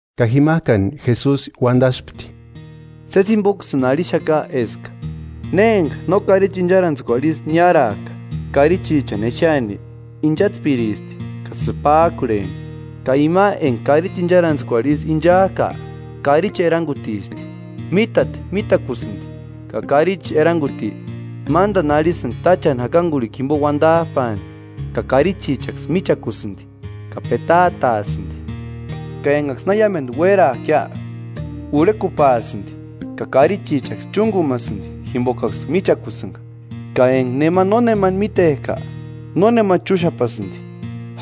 Ka jimajkani Jesusi uandaspti: “Sési jimboksïni arhixaka eska, ne enga no karichi incharantskuarhu isï niárajka karichichani exeani, inchatspiristi ka sïpajkurheni. Ka ima enga karichi incharantskuarhu isï inchajka karichi erangutisti. Mítati mítakusïndi, ka karichi eranguti mándani arhisïndi táchani jakangurhikua jimbo uandajpaani, ka karichichaksï míchakusïndi, ka petaataasïndi, ka engaksï na iámendu uérajkia, urhekupaasïndi, ka karichichaksï chúngumasïndi jimbokaksï michakusïnga. Ka enga nema nónemani mítejka, nónema chúxapasïndi,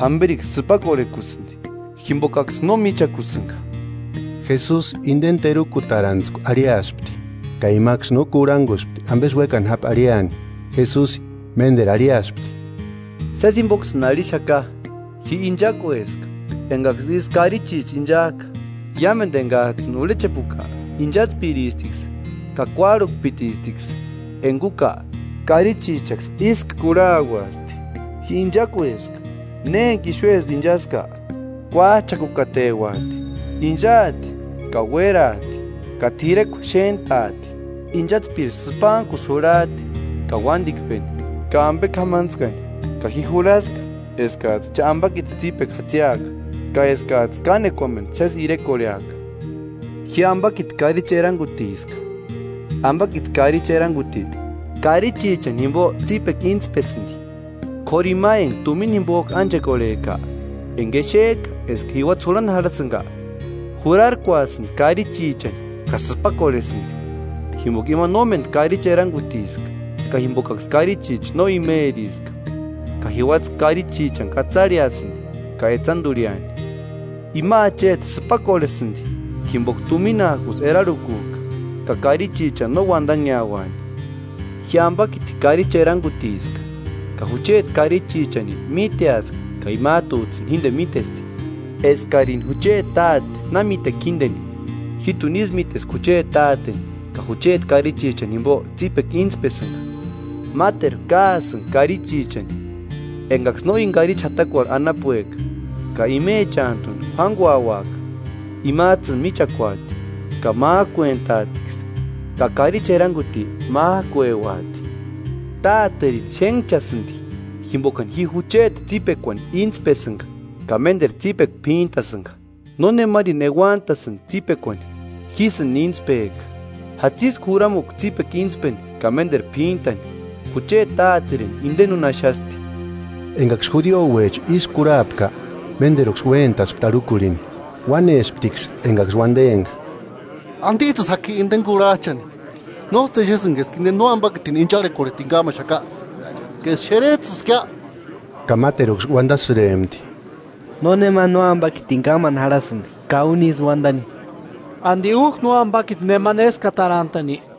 jamberiksï sïpakorhekusïndi, jimbokaksï no míchakusïnga.” Jesusi indeni terukutarantskua arhiaspti, ka imaksï no kurhanguspti ambesï uékani japi arhiaani. Jesusi ménderu arhiaspti: “Sési jimboksïni arhixaka: Ji inchakueska, engaksï isï karichicha inchajka. Iámendu engajtsïni urhechepuka inchatspiristiksï ka kuárhukpitistiksï; enga úka, karichichaksï ísku kurhauasti. Ji inchakueska: Ne enga ixuesï inchaska, kuájchakukateuati. Inchaati ka uéraati ka t'irekua xéntaati.” “Inchatspiri sïpantkusï jurhajti ka uándikpeni ka ambe k'amantskani; ka ji jurhaska eskajtsï cha ambakiti tsípekua jatsiaka, ka eskajtsï kánekuamendu sési irekorheaka. Ji ambakiti karichi erangutiska. Ambakiti karichi eranguti, karichichani jimbo tsípekua intspesïndi. K'óru ima enga tumina jimbojku ánchekorhejka, enga exejka eska jiuatsï jurhani jarhasïnga, jurarkuasïndi karichichani ka sïpakorhesïndi, jimboka ima nómendu karichi erangutiska ka jimbokaksï karichicha no imeriska. Ka jiuatsï karichichani katsarheasïndi ka etsandurhiani. Ima acheti sïpakorhesïndi jimboka tuminajkusï erarhukujka, ka karichichani no uandanheauani.” “Ji ambakiti karichi erangutiska; ka jucheti karichichani míteaska ka imajtujtsïni jíndeni mítesti, eskarini jucheti Táte na míteka jíndeni, jíjtuni ísï míteska jucheti Táteni ka jucheti karichichani jimbo tsípekua íntspesïnga. Máteru káasïnga karichichani engaksï no íni karichi jatakuarhu anapueka ka imechantuni juánguauaka. Imajtsïni michakuati, ka májkuentaatiksï, ka karichi eranguti májkueuati.” “Táterini xénhchasïndi jimbokani ji jucheti tsípekuani íntspesïnga ka ménderu tsípekua p'íntasïnga. Nónemarini euantasïndi tsípekuani, jísïni íntspejka. Jatsïska juramukua tsípekua íntspeni ka ménderu p'íntani. Jucheti Táterini indeni úni axasti.” Engaksï judiouecha ísï kurhapka, ménderuksï uéntaspti arhukurhini. Uánesptiksï engaksï uandempka: –¿Andijtsïsï jaki indeni kurhajchani? ¿Nójtsï exesïnki eska inde nóambakitini incharhekorhetini kámaxaka ka eska xerejtsïskia? Ka máteruksï uandasïrempti: –Nónema nóambakitini kámani jarhasïndi ka úni ísï uandani. ¿Andi újki nóambakiti nemani éskatarantani?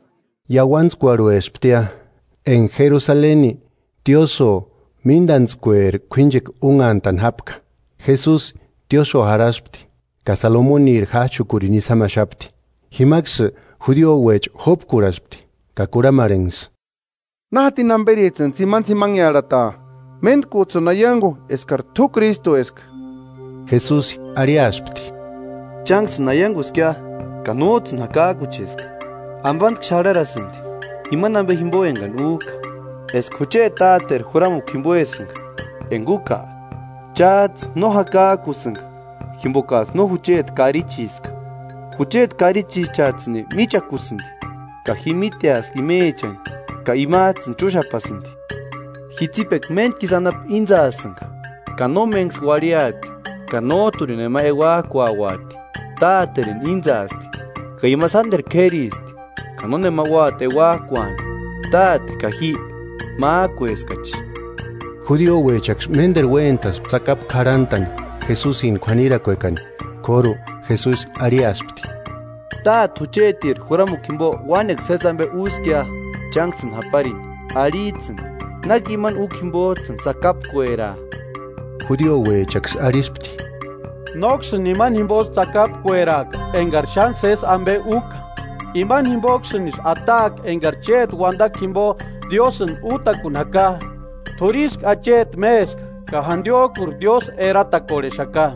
Iauantskuarhuesptia, enga Jerusaleni Tiosïo Míndantskueri k'uínchekua únhantani jápka. Jesusi tiósïo jarhaspti, ka Salomoniri jájchukurini isï jámaxapti. Jimaksï judiouecha jópkurhaspti ka kurhamarhenksï: –¿Na jatini jamberijtsïni tsimanitsimanhearhataa? Méntkujtsïni aiangu eskari t'u Krístueska. Jesusi arhiaspti: –Chánksïni aianguskia, ka nójtsïni jakajkucheska. Ambantku xarharasïndi, imani ambe jimbo engani újka, eska jucheti táteri juramukua jimboesïnga; enga úka, chájtsï no jakajkusïnga, jimbokajtsï no jucheti karichiska. Jucheti karichichajtsïni míchakusïndi, ka ji míteska imechani ka imajtsïni chúxapasïndi. Ji tsípekua méntku isï anapu íntsaasïnga, ka nómenksï uarhiaati ka nójturini nema euajkuauati. Táterini íntsaasti, ka ima sánderu k'éristi ka nónema úati euajkuani. Táte ka ji májkueskachi. Judiouechaksï ménderu uéntaspti tsakapu k'arhantani Jesusini k'uanirakuekani, k'óru Jesusi arhiaspti: –Táte juchetiri juramukua jimbo uánekua sési ambe úskia chánksïni japarini; arhijtsïni ¿Náki ima úkua jimbojtsïni tsakapkueraa? Judiouechaksï arhispti: –Nóksïni imani jimbosï tsakapkueraaka engari xáni sési ambe úka, imani jimboksïnisï ataaka engari chéti uandakua jimbo Diósïni útakuni jaka. T'úri ísku acheti méska, ka jandiojkuri Diósï eratakorhexaka.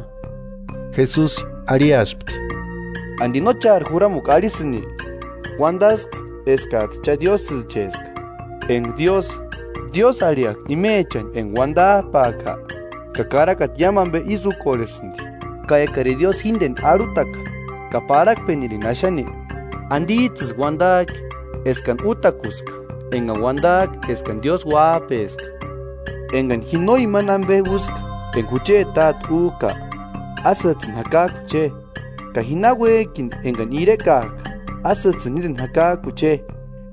Jesusi arhiaspti: –¿Andi no chári juramukua arhisïni? “Uandaska eskajtsï cha diósïcheska. Enga Diósï, diósï arhiajka imechani enga Uandajpaaka, ka karakata iámu ambe ísï úkorhesïndi. Ka ekarini Diósï jíndeni arhutaka ka parhakpenirini axani, ¿Andijtsïsï uandajki eskani útakuska engani uandajka eskani Diósï Uájpeska? Engani ji no imani ambe úska enga jucheti Táte újka, ásïjtsïni jakajkuche je. Ka ji náuejki engani irekajka, ásïjtsïni jíndeni jakajkuche je,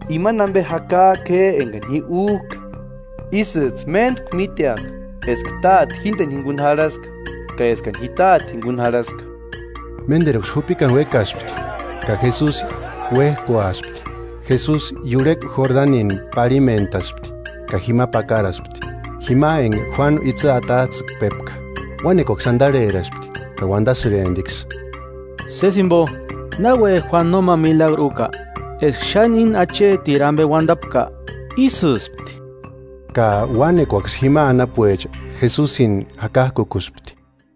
imani ambe jakajku je engani újka, ísïjtsï méntku míteaka eska Táte jíndeni jinguni jarhaska ka eskani ji Táte jinguni jarhaska.” Ménderuksï jupikani uékaspti, ka Jesusi uéjkuaspti. Jesusi iurhekua Jordanini parhimentaspti, ka jima pakaraspti, jima enga Juánu itsï atajtsïkpepka. Uánekuaksï andarheraspti ka uandasïremptiksï: –Sési jimbo, náuejki Juánu nóma milagru úka, eska xáni íni achetiri ambe uandantapka, ísïspti. Ka uánekuaksï jima anapuecha Jesusini jakajkukuspti.